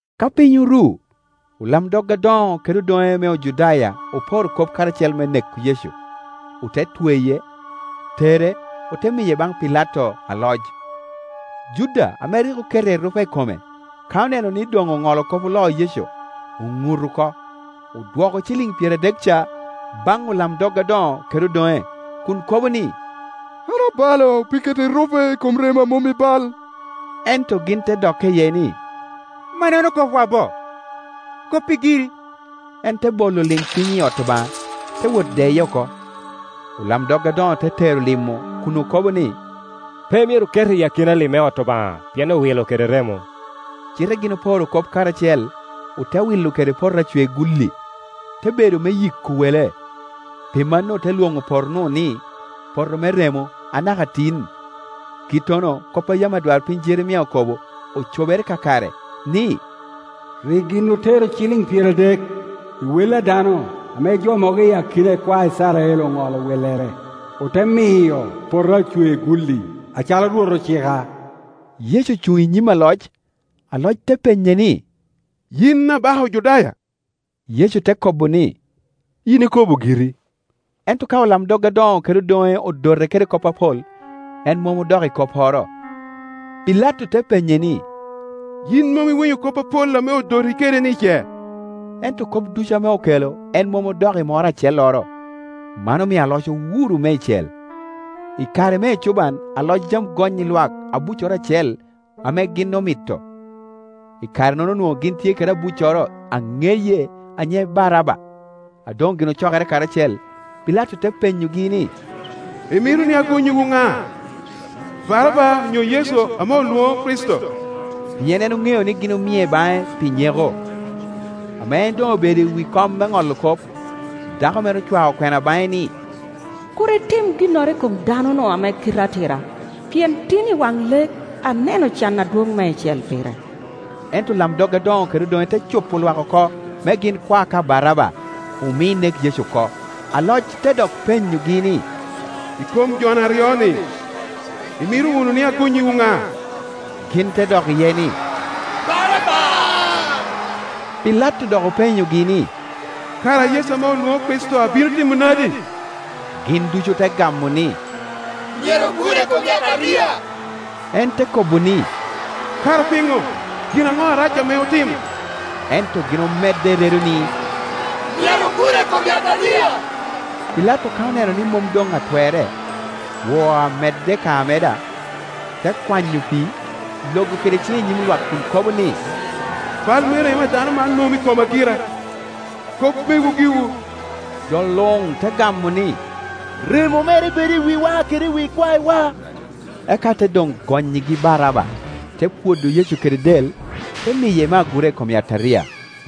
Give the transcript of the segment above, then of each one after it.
Ka piny oru, olamdog adoŋo kede odoŋe me Ojudaya oporo kop karacel me neko Yecu; ote tweye, tere, ote miye baŋ Pilato aloc. Juda ame rik oketo erupe i kome, ka oneno ni doŋ oŋolo kop oloo Yecu, oŋut oko, odwoko ciliŋ pyeradek ca baŋ olamdog adoŋo kede odoŋe, kun kobo ni, “An abalo pi keto erupe i kom remo a mom i bal.” Ento gin te dokke iye ni, “Mannono kopwa bo? Koppi giri.” En te bolo lim piny i ot Obaŋa, te wot deye oko. Olamdog adoŋo te tero lim-mu kun okobo ni, “Pe myero oket i akina lim me ot Obaŋa, pien owino kede remo.” Cite gin oporo kop karacel, ote wilo kede poto acwegulli, te bedo me yiko wele. Pi mano ote lwoŋo poto-nu ni, Poto me Remo, anaka tin. Kittono kop a yam adwarpiny Jeremia okobo ocobere kakare, ni, “Rik gin otero ciliŋ pyeradek, i wel a dano ame jo mogo i akina ikwae Icrael oŋolo wellere, ote miyo poto acwe-gulli, acalo Rwot ocika.” Yecu ocuŋ i nyim aloc, aloc te penye ni, “Yin Abaka Ojudaya?” Yecu te kobo ni, “Yin ikobo giri.” Ento ka olamdog adoŋo kede odoŋe odote kede kop apol, en mom odok i kopporo. Pilato te penye ni, “Yin mom iwinyo kop apol ame odoti kede-ni, ce?” Ento kop ducu ame okelo en mom odok i moro acelloro; man omio aloc owuro meicel. I kare me ecuban aloc yam goŋnyi lwak abuccoro acel ame gin omito. I kare-nono onwoŋo gin tye kede abucoro a ŋeye, a nyiŋe Baraba. A doŋ gin ocokere karacel, Pilato te penyogi ni, “Imito ni agonnyiwu ŋa, Baraba, onyo Yecu ame olwoŋo Kricito?” Pien en oŋeo ni gin omie baŋe ni nyeko. Ame en doŋobedo i wi kom me ŋolo kop, dako mere ocwao kwena baŋe ni, “Kur itim ginnoro i kom dano-nu ame kite atira, pien tin i waŋ lek aneno can adwoŋ meicel pire.” Ento olamdog adoŋo kede odoŋe te cupo lwak oko me gin kwa ka Baraba, omi nek Yecu oko. Aloc te dok penyogi ni, “I kom jo-ni aryo-ni imito wunu ni gonnyiwu ŋa?” Gin te dok iye ni, “Baraba.” Pilato dok openyogi ni, “Kara Yecu ame olwoŋo Kricito abino timo nadi?” Gin ducu ote gamo ni, “Myero gure i kom yataria.” En te kobo ni, “Kara piŋo? Gin aŋo arac ame otimo?” Ento gin omedde i redo ni, “Myero gure i kom yataria!” Pilato ka oneno ni mom doŋatwerre, woo amedde ka ameda, te kwanyo pii, logo kede ciŋe i nyim lwak kun kobo ni, “Bal me remo a dano man mom i koma gira; kop mewu giwu.” Jo luŋ te gamo ni, “Remo mere bed i wiwa kede i wi ikwaewa.” Eka te doŋgonnyigi Baraba, te pwodo Yecu kede del, te miye me agura i kom yataria.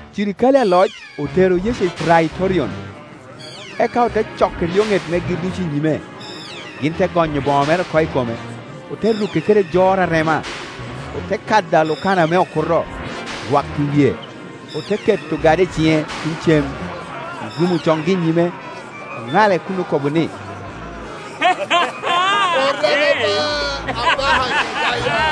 Cirikale aloc otero Yecu i Praitorion, eka ote coko eryoŋet megi ducu i nyime. Gin te gonyo boŋo mere oko i kome, ote ruke kede jor arema. Ote kado alukana me okuto, rwako i wie, ote keto ogada i ciŋe tuŋ cem. Orumo congi i nyime, oŋale kun okobo ni, “Oreme ba, Abaka Ojudaya!”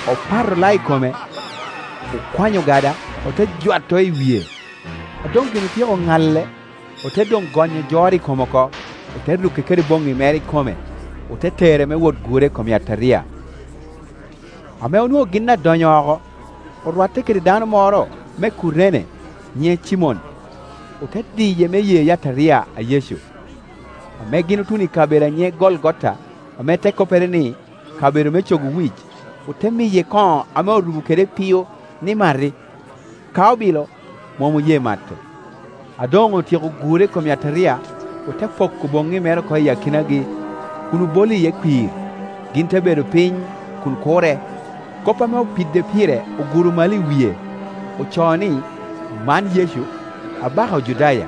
Opato lao i kome, okwanyo ogada, ote jwato i wie. A doŋgin otyeko ŋale, ote doŋgonyo jor i kome oko, ote ruke kede boŋŋi mere ikome, ote tere me wot gure i kom yataria. Ame onwoŋo gin adonyo oko, orwatte kede dano moro me Kurene nyiŋe Cimon, ote diye me ye yataria a Yecu. Ame gin otuno i kabedo a nyiŋe Golgota, ame te koppere ni, kabedo me Cogo Wic, ote miye kono ame orubo kede epio ni mati; ka obilo, mom oye mato. A doŋotyeko gure i kom yataria, ote poko boŋŋi me re oko i akinagi kun obolo iye kwir; gin te bedo piny kuno kure. Kop ame opide pire oguro malo i wie; ocoo ni, “Man Yecu, Abaka Ojudaya.”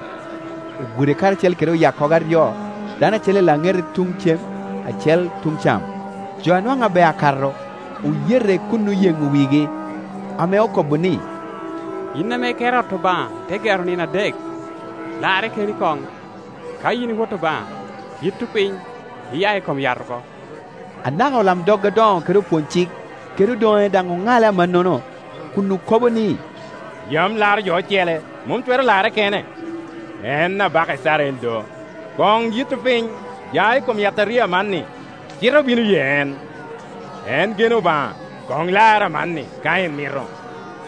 Ogure karacel kede oyakkogo aryo, dano acel i laŋete tuŋ cem, acel tun cam. Jo a nwaŋ abeo akato oyete kun oyeŋo wigi, ame okobo ni, “Yin ame iketo ot Obaŋa ite gero i nino adek, larre keni koŋ. Ka yin i Wot Obaŋa, yitto piny, iya i kom yat oko!” Anaka olamdog adoŋo kede opwonycik kede odoŋe daŋ oŋale amannono kun okobo ni, “Yam laro jo ocele, mom twero larre kene. En Abaka Icrael do; koŋ yitto piny, ya i kom yataria amanni, cite obino ye en. En geno Obaŋa, koŋ larre amanni, ka en mito;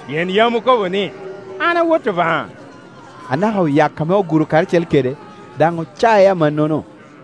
pien yam okobo ni, ‘An a Wot Obaŋa.’” Anaka oyak ame oguro karacel kede daŋ acoc amannono.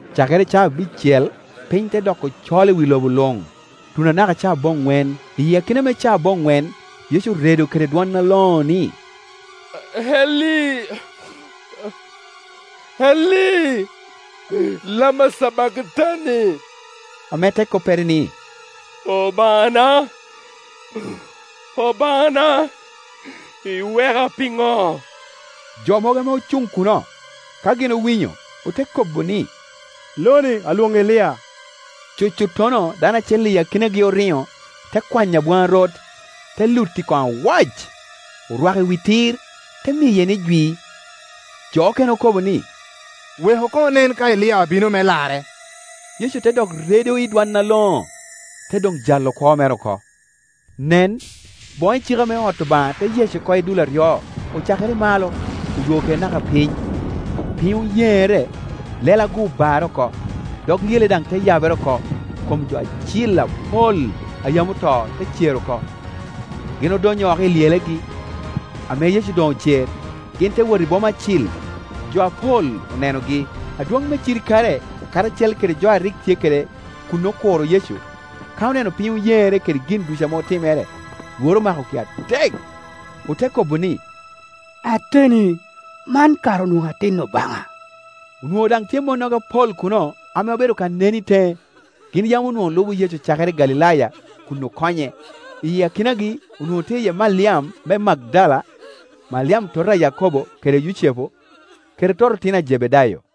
Cakere i caa abicel piny te doko col i wi lobo luŋ, tuno anaka caa aboŋwen. I akina me caa aboŋwen Yecu oredo kede dwon aloŋo ni, “Eli, Eli, lama cabaktani?” ame te koppere ni, “Obaŋana, Obaŋana, iweka piŋo?” Jo mogo ame ocuŋ kuno, ka gin owinyo, ote kobo ni, “Lo-ni alwoŋo Elia.” Cucuttono dano acel i akinagi oriŋo, te kwanyo abwaŋarot, te luto i kono awac, orwako i wi tir, te miye ni jwi. Jo okene okobo ni, “Weku koŋ onen ka Elia abino me larre.” Yecu te dok redo i dwon aloŋo, te doŋ jalo kwo mere oko. Nen, boŋo icika me ot Obaŋa te yec oko i dul aryo, ocakere i malo, odwogo kede naka piny. Piny oyeŋere, lela-gu obarre oko; dog lyele daŋ te yabere oko, kom jo acil apol a yam oto te cer oko. Gin odonyo oko i lyelegi; ame Yecu doŋ ocer, gin te wot i boma acil, jo apol onenogi. Adwoŋ me cirikale karacel kede jo a rik tye kede kun okuro Yecu, ka oneno piny oyeŋere kede gin ducu ame otimere, lworo omakogi atek, ote kobo ni, “Ateni, man kara onwoŋo atin Obaŋa!” Onwoŋo daŋ tye monnogo apol kuno ame obedo ka neno i teŋe; gin yam onwoŋo lubo Yecu cakere i Galilaya kun okonye. I akinagi onwoŋo tye Maliam me Magdala. Maliam tota a Yakobo kede Yucepu, kede toto otino a Jebedayo.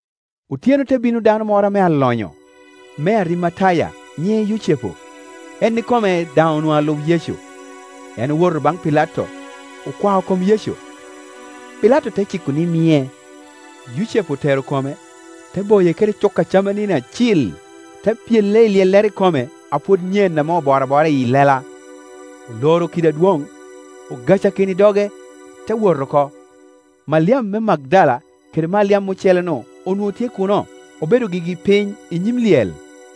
Otyeno te bino dano moro ame alonyo, me Arimataya, nyiŋe Yucepu; en ikome daŋ onwoŋo alub Yecu. En owoto baŋ Pilato, okwao kom Yecu. Pilato te ciko ni mie. Yucepu otero kome, te boye kede cuka camanini acil, te pyele i lyellere ikome a pwod nyen ame oboro abora i lela, oloro kidi adwoŋ, ogacakino i doge, te wot oko. Maliam me Magdala kede Maliam ocele-nu onwoŋo tye kuno, obedo gigi piny i nyim lyel.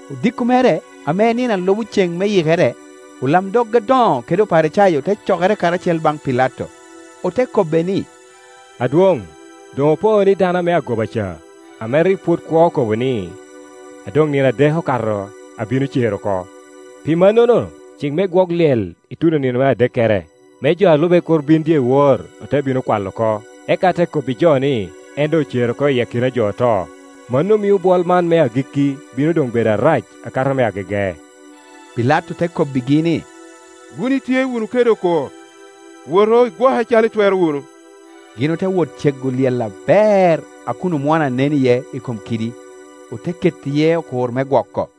Odiko mere, ame en nino a lubo ceŋ me Yikere, olamdog adoŋo kede Oparicayo te cokere karacel baŋ Pilato, ote kobbe ni, “Adwoŋ, doŋ opo ni dano ame agoba ca, ame rik pwod kwo okobo ni, ‘A doŋ nino adek okato abino cer oko.’ Pi mannono, cik me gwok lyel ituno i nino me adekkere, me jo a lube kur bin dyewor ote bino kwalo oko, eka ote kobbi jo ni, ‘En doŋ ocer oko i akina jo oto’; mano mio bwol man me agikki bino doŋ bedo arac akato me agege.” Pilato te kobbigi ni, “Wun itye wunu kede okur; wotu, igwoke acalo itwero wunu.” Gin ote wot cego lyel aber a kun omwono anen iye i kom kidi, ote keto iye okur me gwoko.